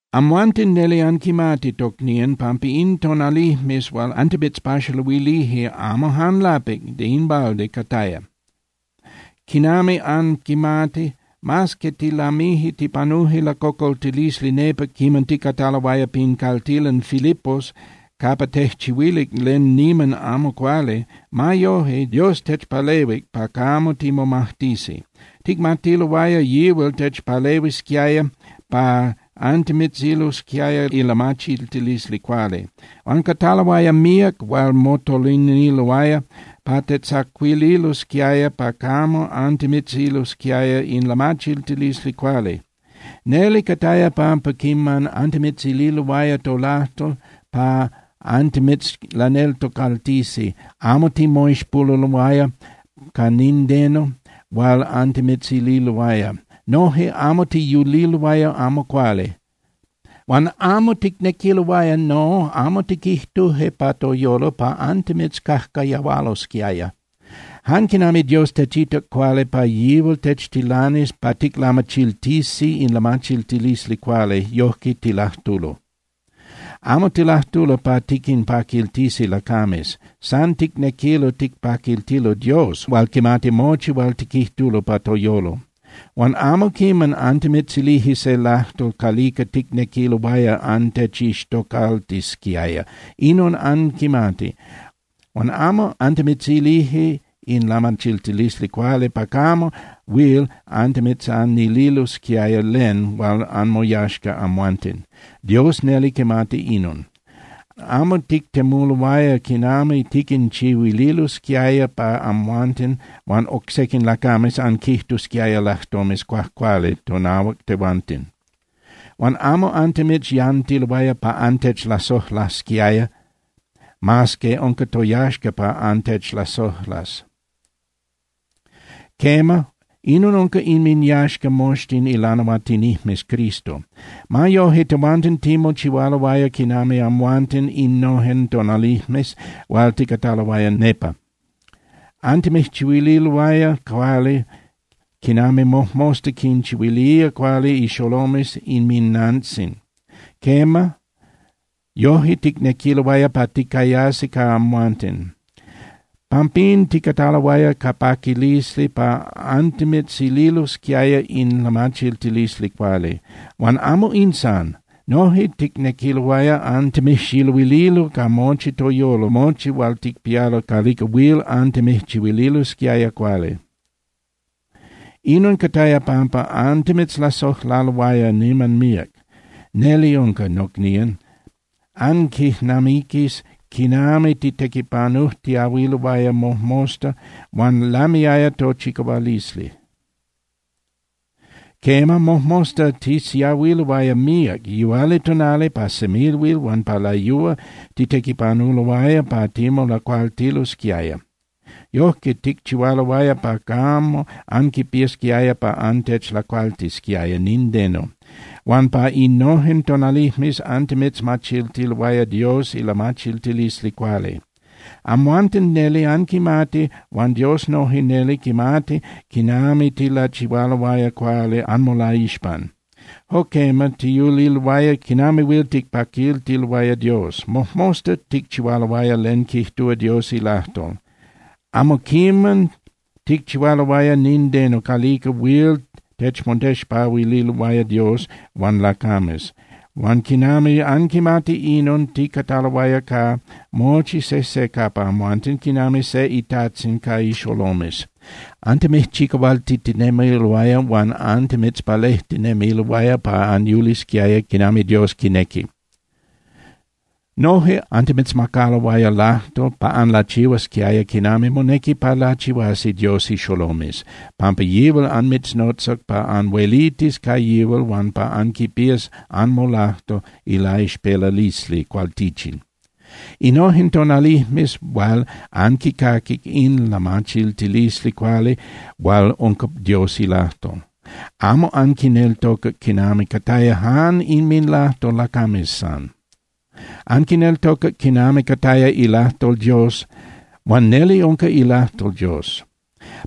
Amhuanten neli anquimati, tocnían, pampa in tonalijmes hual antimitzpaxaluilije, amo jan lapic (de in balde) cataya. Quinami anquimati, mas que tilamije tipanuje lacocoltilisli nepa quiman ticataloaya pin caltilan Filipos capa tejchihuilic len niman amo cuali, ma yoje, Dios techpalehuic pa camo timomajtisi. Ticmatiloaya yihual techpalehuisquiaya pa antimitzililosquiaya ilamachiltilisli cuali. Huan cataloaya míac hual motoliniloaya pa tejtzacuililosquiaya pa camo antimitzililosquiaya in lamachiltilisli cuali. Neli cataya pampa quiman antimitzililoaya tolajtol pa antimitzlaneltocaltisi, amo timoixpoluloaya ca nindeno hual antimitzililoaya. Noje amo tiyuliloaya amo cuali. Huan amo ticnequiloaya, no, amo tiquijtuje pa toyolo pa antimitzcajcayahualosquiaya. Jan quinami Dios techitac cuali pa yihual techtilanis pa ticlamachiltisi in lamachiltilisli cuali, yojque tilajtulo. Amo tilajtulo pa tiquinpaquiltisi lacames. San ticnequilo ticpaquiltilo Dios hual quimati mochi hual tiquijtulo pa toyolo. Huan amo quiman antimitzilije se lajtol calica ticnequiloaya antechixtocaltisquiaya. Inon anquimati. Huan amo antimitzilije in lamachiltilisli cuali pa yoje huil antimitzanililosquiaya len hual anmoyaxca amhuanten, Dios neli quimati inon. Amo tictemuloaya quinami tiquinchihuililosquiaya pa amhuanten huan oc sequin lacames anquijtusquiaya lajtomes cuajcuali tonahuac tehuanten. Huan amo antimitzyantiloaya pa antechlasojlasquiaya mas que unca toyaxca pa antechlasojlas. Quema, inon unca inminyaxca moxtin ilanahuatinijmes Cristo. Ma yoje, tehuanten timochihualoaya quinami amhuanten innojen tonalijmes hual ticataloaya nepa. Antimijchihuililoaya cuali quinami mojmosta quinchihuilía cuali ixolomes inminantzin. Quema, yoje ticnequiloaya pa ticayasi ca amhuanten. Pampín ticataloaya ca paquilisli pa antimitzililosquiaya in lamachiltilisli cuali. Huan amo in san. Noje ticnequiloaya antimijxiluililo ca mochi toyolo mochi hual ticpialo calica huil antimijchihuililosquiaya cuali. Inon cataya pampa antimitzlasojlaloaya niman míac. Neli unca, nocnían, anquijnamiquía quinami titequipanujtiahuiloaya mojmosta huan lamiaya tochicahualisli. Quema, mojmosta tisiahuiloaya míac. Yihualitonali, pa semilhuil huan pa layúa, titequipanuloaya pa timolacualtilosquiaya. Yojque ticchihualoaya pa camo anquipiasquiaya pa antechlacualtisquiaya nindeno. Huan pa innojen tonalijmes antimitzmachiltiloaya Dios ilamachiltilisli cuali. Amhuanten neli anquimati huan Dios noje neli quimati quinami tilachihualoaya cuali anmolaixpan. Jo quema, tiyuliloaya quinami huil ticpaquiltiloaya Dios. Mojmosta ticchihualoaya len quijtúa Dios ilajtol. Amo quiman ticchihualoaya nindeno calica huil techmotexpahuililoaya Dios huan lacames. Huan quinami anquimati inon, ticataloaya ca mochi sejse capa amhuanten quinami se itajtzin ca ixolomes. Antimijchicahualtitinemiloaya huan antimitzpalejtinemiloaya pa anyulisquiaya quinami Dios quinequi. Noje antimitzmacaloaya lajtol pa anlachihuasquiaya quinami monequi pa lachihuasi Dios ixolomes, pampa yihual anmitznotzac pa anhuelitis ca yihual huan pa anquipías anmolajco ilaixpelalisli cualtichin. Innojen tonalijmes hual anquicaquic in lamachiltilisli cuali hual unca Dios ilajtol, amo anquineltocac quinami cataya jan inminlajtol lacames san. Anquineltocac quinami cataya ilajtol Dios. Huan neli unca ilajtol Dios.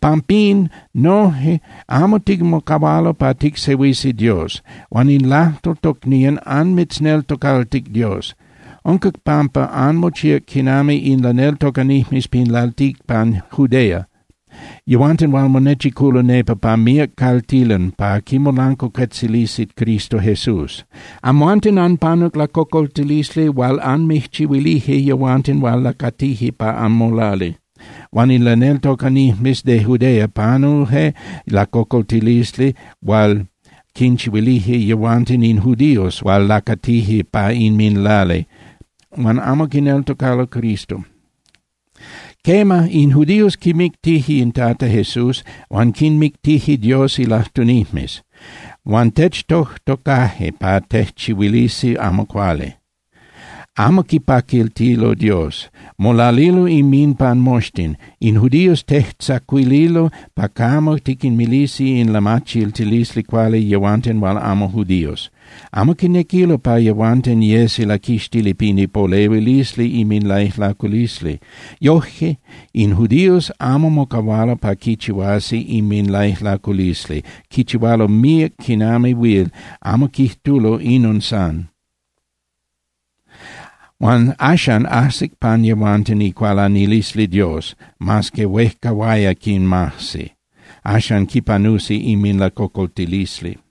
Pampín noje amo timocahualo pa ticsehuisi Dios. Huan in lajtol, tocnían, anmitzneltocaltic Dios. Unca pampa anmochíac quinami in laneltocanijmes pin lalticpan Judea, yehuanten hual monechiculo nepa pa míac caltilan pa quimolancuacuetzilisi Cristo Jesús. Amhuanten anpanuc lacocoltilisli hual anmijchihuilije yehuanten hual lacatije pa anmolali. Huan in laneltocanijmes de Judea panuje lacocoltilisli hual quinchihuilije yehuanten in judíos hual lacatije pa inminlali huan amo quineltocalo Cristo. Quema, in judíos quimictije in Tata Jesús huan quinmictije Dios ilajtunijmes. Huan techtojtocaje pa tejchihuilisi amo cuali. Amo quipaquiltilo Dios, molalilo inminpan moxtin. In judíos tejtzacuililo pa camo tiquinmilisi in lamachiltilisli cuali yehuanten hual amo judíos. Amo quinequilo pa yehuanten yesi laquixtili pin ipolehuilisli inminlaijlaculisli. Yoje in judíos amo mocahualo pa quichihuasi inminlaijlaculisli, quichihualo míac quinami huil, amo quijtulo “Inon san”. Axan ajsic pan yehuanten icualanilisli Dios, mas que huejcahuaya quinmajsi. Axan quipanusi inminlacocoltilisli.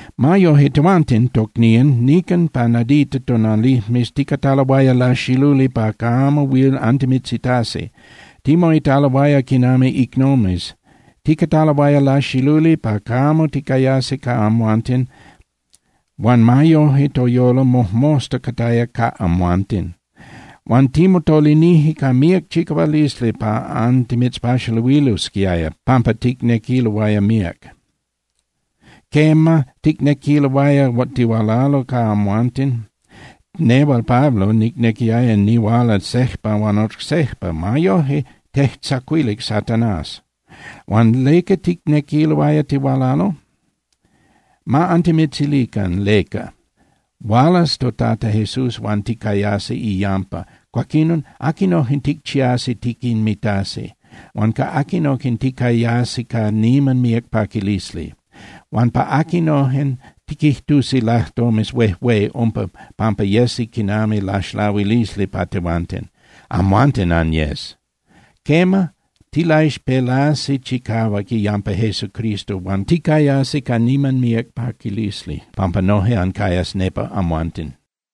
Ma yoje, tehuanten, tocnían, nican pa nadita tonalijmes ticataloaya laxiluli pa camo huil antimitzitasi. Timoitaloaya quinami icnomes. Ticataloaya laxiluli pa camo ticayasi ca amhuanten, huan ma yoje, toyolo mojmosta cataya ca amhuanten. Huan timotolinije ca míac chicahualisli pa antimitzpaxaluililosquiaya, pampa ticnequiloaya míac. Quema, ticnequiloaya tihualalo ca amhuanten, nehual Pablo nicnequiaya nihuala sejpa huan oc sejpa. Ma yoje, tejtzacuilic Satanás. Huan ¿leca ticnequiloaya tihualalo? Ma antimitzilican leca. Hualas toTata Jesús huan ticayasi iyampa, cuaquinon ¿aquinojen ticchiasi tiquinmitasi? Huan ¿ca aquinojen ticayasi ca niman míac paquilisli? Huan ¿pa aquinojen tiquijtusi lajtomes huejué umpa pampa yesi quinami laxlahuilisli pa tehuanten? Amhuanten anyes. Quema, tilaixpelasi chicahuac iyampa Jesucristo huan ticayasi ca niman míac paquilisli pampa noje ancayas nepa amhuanten.